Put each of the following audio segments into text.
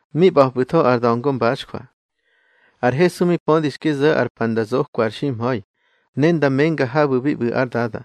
Mi ꞌba̱pꞌu̱tho ar da̱ngo mbaxjwa. Ar Hesu mi pödi xki zo̱ ar pa nda zokwa ar ximha̱i, ne nda menga habu̱ bi ꞌbu̱ ár Dada.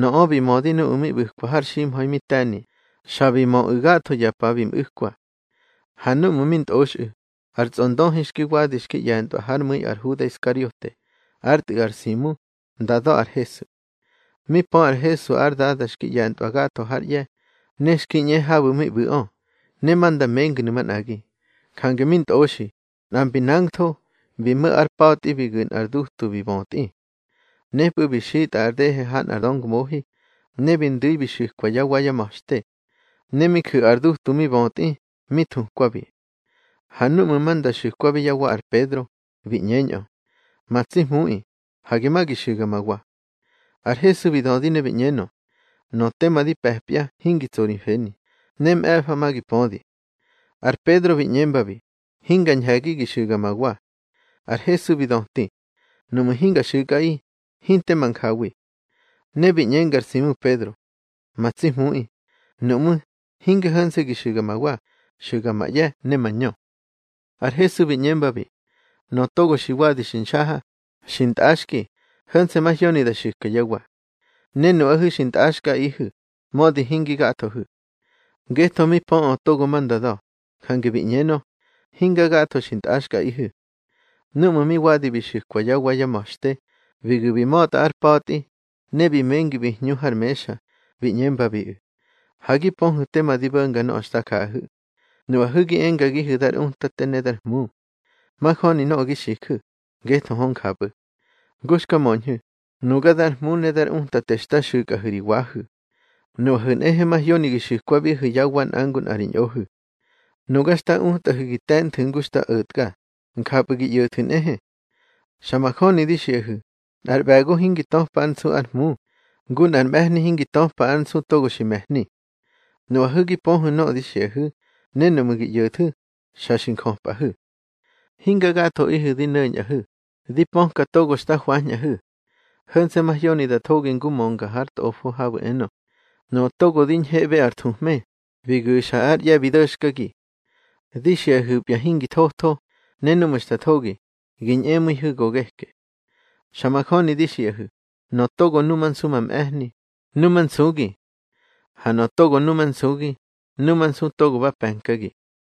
Nöꞌö bi mödi nuꞌu̱ mi ꞌbu̱kwa har ximha̱i mi te̱ni, xa bi möꞌu̱ gatho ya pa bi mꞌu̱kwa. Ha núꞌmu̱ mi ntꞌoxꞌu̱, ar tsꞌondöhi xki wadi xki ꞌye̱ntꞌwa hár mu̱i ar Huda Iskariote, ár tꞌu̱ ar Simu, nda da̱ ar Hesu. Mi pö ar Hesu ár Dada xki ꞌye̱ntꞌwa gatho hár ꞌye̱, ne xki ꞌñe habu̱ mi ꞌbu̱ꞌö, ne ma nda mengnu̱ manꞌagi, jange mi ntꞌoxi, nꞌa mbi nangtho, bi mo̱ ár pa̱tꞌi, bi gu̱ nꞌar dutu bi bötꞌi. Nepꞌu̱ bi xitꞌa ar dehe ha nꞌar döngmohi, ne bi ndu̱i bi xu̱kwa yá wa yá ma̱xte. Ne mi ju̱ ar dutu mi bötꞌi, mi thukwabi. Ha núꞌmu̱ ma nda xu̱kwabi yá wa ar Pedro, bi ꞌñeñꞌö: —Ma tsi Hmuꞌi, hage ma gi xu̱ga ma wa. Ar Hesu bi dödi ne bi ꞌñenö: —Nöꞌö tema di pe̱pya hingi tso ri mfeni, ne mꞌe̱fa ma gi pödi. Ar Pedro bi ꞌñembabi: —Hinga ñhe̱gi gi xu̱ga ma wa. Ar Hesu bi döti: —Nuꞌmu̱ hinga xu̱kꞌaꞌi, hinte ma njawi. Ne bi ꞌñenga ar Simu Pedro: —Ma tsi Hmuꞌi, nuꞌmú̱, hinge ho̱nse̱ gi xu̱ga ma wa, xu̱ga ma ꞌye̱ ne ma ñö. Ar Hesu bi ꞌñembabi: —Nöꞌö togo xi wadi xi nxaha, xi ntꞌaxki, ho̱nse̱ mahyoni da xu̱ka yá wa. Ne nuꞌahu̱ xi ntꞌaxkꞌaꞌihu̱, mödi hingi gathohu̱. Ngetho mi pöꞌö togo ma nda da̱, jange bi ꞌñenö: Hinga gatho xi ntꞌaxkꞌaꞌihu̱. Núꞌmu̱ mi wadi bi xu̱kwa yá wa yá ma̱xte, bi gu̱ bi ma̱tꞌa ár pa̱tꞌi, ne bi mengi bi hñu har mexa, bi ꞌñembabiꞌu̱: —Ha gi pöhu̱ tema di bo̱nga nöꞌö xta jaꞌahu̱. Nuꞌahu̱ gi engagihu̱ dar Utate ne dar Hmu. Majöni nöꞌö gi xiju̱, ngetho hö njapꞌu̱. Ngu xka möñhu̱, nuga dar Hmu ne dar Utate xta xu̱kꞌahu̱ ri wahu̱. Nuꞌahu̱ nꞌehe mahyoni gi xu̱kwabihu̱ yá wa nꞌa ngu nꞌa ri ñꞌohu̱. Nuga xta utꞌahu̱ gi te̱nthu̱ ngu xta o̱tka, njapꞌu̱ gi ꞌyo̱thu̱ nꞌehe. Xa majöni di xiꞌahu̱, nꞌar ꞌbe̱go hingi töpa ár nsu ár Hmu, ngu nꞌar mꞌe̱hni hingi töpa ár nsu togo xi me̱hni. Nuꞌahu̱ gi pöhu̱ nöꞌö di xiꞌahu̱, ne nuꞌmu̱ gi ꞌyo̱thu̱, xa xi njöpꞌahu̱. Hinga gathoꞌihu̱ di no̱ñꞌahu̱, di pöka togo xta hwañꞌahu̱. Ho̱nse̱ mahyoni da thogi ngu mönga har Tꞌofo habu̱ enö: Nöꞌö togo di ñheꞌbe ar thuhme, bi gu̱xa ár ꞌye̱ bi do̱xkagi. Di xiꞌahu̱pya hingi thotho, ne núꞌmu̱ xta thogi, gi ñꞌemu̱ihu̱ go geke. Xa majöni di xiꞌahu̱, nöꞌö togo numansu ma mꞌe̱hni, numansugi. Ha nöꞌö togo numansugi, numansu togo ba pe̱nkagi.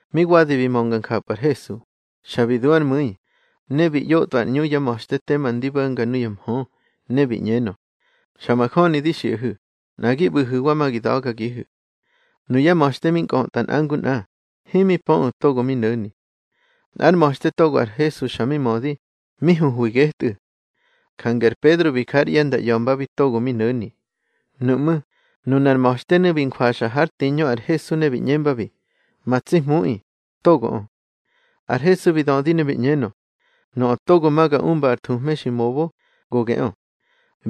Mi wadi bi mönga njapꞌu̱ ar Hesu, xa bi du ár mu̱i, ne bi ꞌyotꞌwa ar ꞌñu yá ma̱xte tema ndi bo̱nga nuya mhö, ne bi ꞌñenö: —Xa majöni di xiꞌahu̱, nꞌa gi ꞌbu̱hu̱wa ma gi da̱gagihu̱. Nuyá ma̱xte mi nkꞌötꞌa nꞌa ngu nꞌa, himi pöꞌu̱ togo mi no̱ni. Nꞌár ma̱xte togo ar Hesu xa mi mödi, mi huhwi getꞌu̱. Jange ar Pedro bi ja ár ꞌye̱ nda ꞌya̱mbabi togo mi no̱ni. Nuꞌmú̱, nunar ma̱xtenu̱ bi njwaxa hár tiñö ar Hesu, ne bi ꞌñembabi: —Ma tsi Hmuꞌi, togoꞌö. Ar Hesu bi dödi ne bi ꞌñenö: —Nöꞌö togo ma ga umba ar thuhme xi mobo, go geꞌö.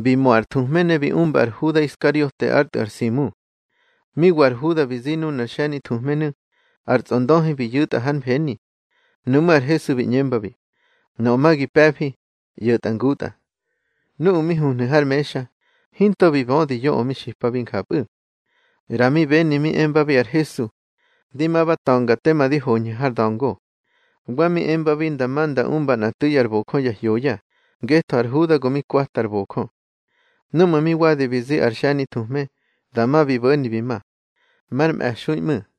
Bi mo ar thuhme ne bi umba ar Huda Iskariote ár tꞌu̱ ar Simu. Mi wa ar Huda bi zi nunar xe̱nithuhmenu̱, ar tsꞌondöhi bi yu̱tꞌa hár mfeni. Nuꞌmú̱ ar Hesu bi ꞌñembabi: —Nöꞌö ma gi pe̱fi, ꞌyo̱tꞌa ngutꞌa. Nuꞌu̱ mi huhnu̱ har mexa, hinto bi bödi yoꞌö mi xipabi njapꞌu̱. ꞌRa mi beni mi emba ar Hesu: Di ma ba ta̱nga tema di hoñhu̱ har da̱ngo. Wa mi embabi nda ma nda umba nꞌa tu̱i ar bojö ya hyoya, ngetho ar Huda go mi kwata ar bojö. Núꞌmu̱ mi wadi bi zi ar xe̱nithuhme, dama bi bo̱ni bi ma. Mar mꞌe̱xui ꞌmu̱.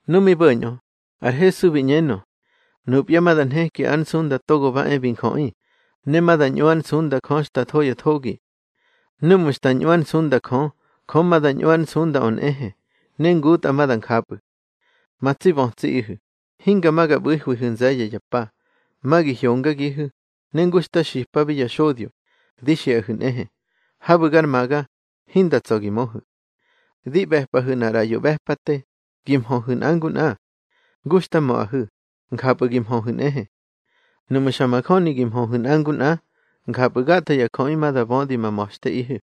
Nu mi bo̱ñꞌö, ar Hesu bi ꞌñenö: —Nupya ma da nheki ár nsunda Togo ba e bi Njöꞌi, ne ma da ñꞌu ár nsunda Jö xta tho ya thogi. Núꞌmu̱ xta ñꞌu ár nsunda Jö, Jö ma da ñꞌu ár nsundaꞌö nꞌehe, ne ngutꞌa ma da njapꞌu̱. Ma tsi bötsiꞌihu̱, hinga ma ga ꞌbu̱hwihu̱ nze̱ye̱ ya pa. Ma gi hyongagihu̱, ne ngu xta xipabi ya xodyo, di xiꞌahu̱ nꞌehe: Habu̱ gar maga, hinda tsa̱ gi möhu̱. Di ꞌbe̱pꞌahu̱ nꞌar ꞌraꞌyo ꞌbe̱pate, gi mhöhu̱ nꞌa ngu nꞌa. Ngu xta möꞌahu̱, njapꞌu̱ gi mhöhu̱ nꞌehe. Nuꞌmu̱ xa majöni gi mhöhu̱ nꞌa ngu nꞌa, njapꞌu̱ gatho ya jöꞌi ma da bödi ma ma̱xteꞌihu̱.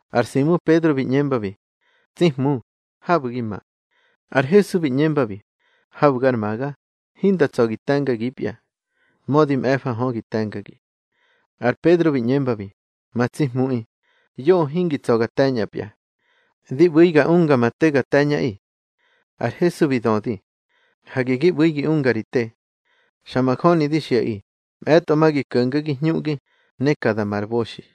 Ar Simu Pedro bi ꞌñembabi: —Tsi Hmu, habu̱ gi ma. Ar Hesu bi ꞌñembabi: —Habu̱ gar maga, hinda tsa̱ gi te̱ngagipya, mödi mꞌe̱fa hö, gi te̱ngagi. Ar Pedro bi ꞌñembabi: —Ma tsi Hmuꞌi, yoꞌö hingi tsa̱ ga te̱ñꞌapya. Di ꞌbu̱i ga unga ma te ga te̱ñꞌaꞌi. Ar Hesu bi döti: —Hage gi ꞌbu̱i gi unga ri te. Xa majöni di xiꞌaꞌi, mꞌe̱tꞌo ma gi ko̱ngagi hñuꞌgi, ne ka da ma ar boxi.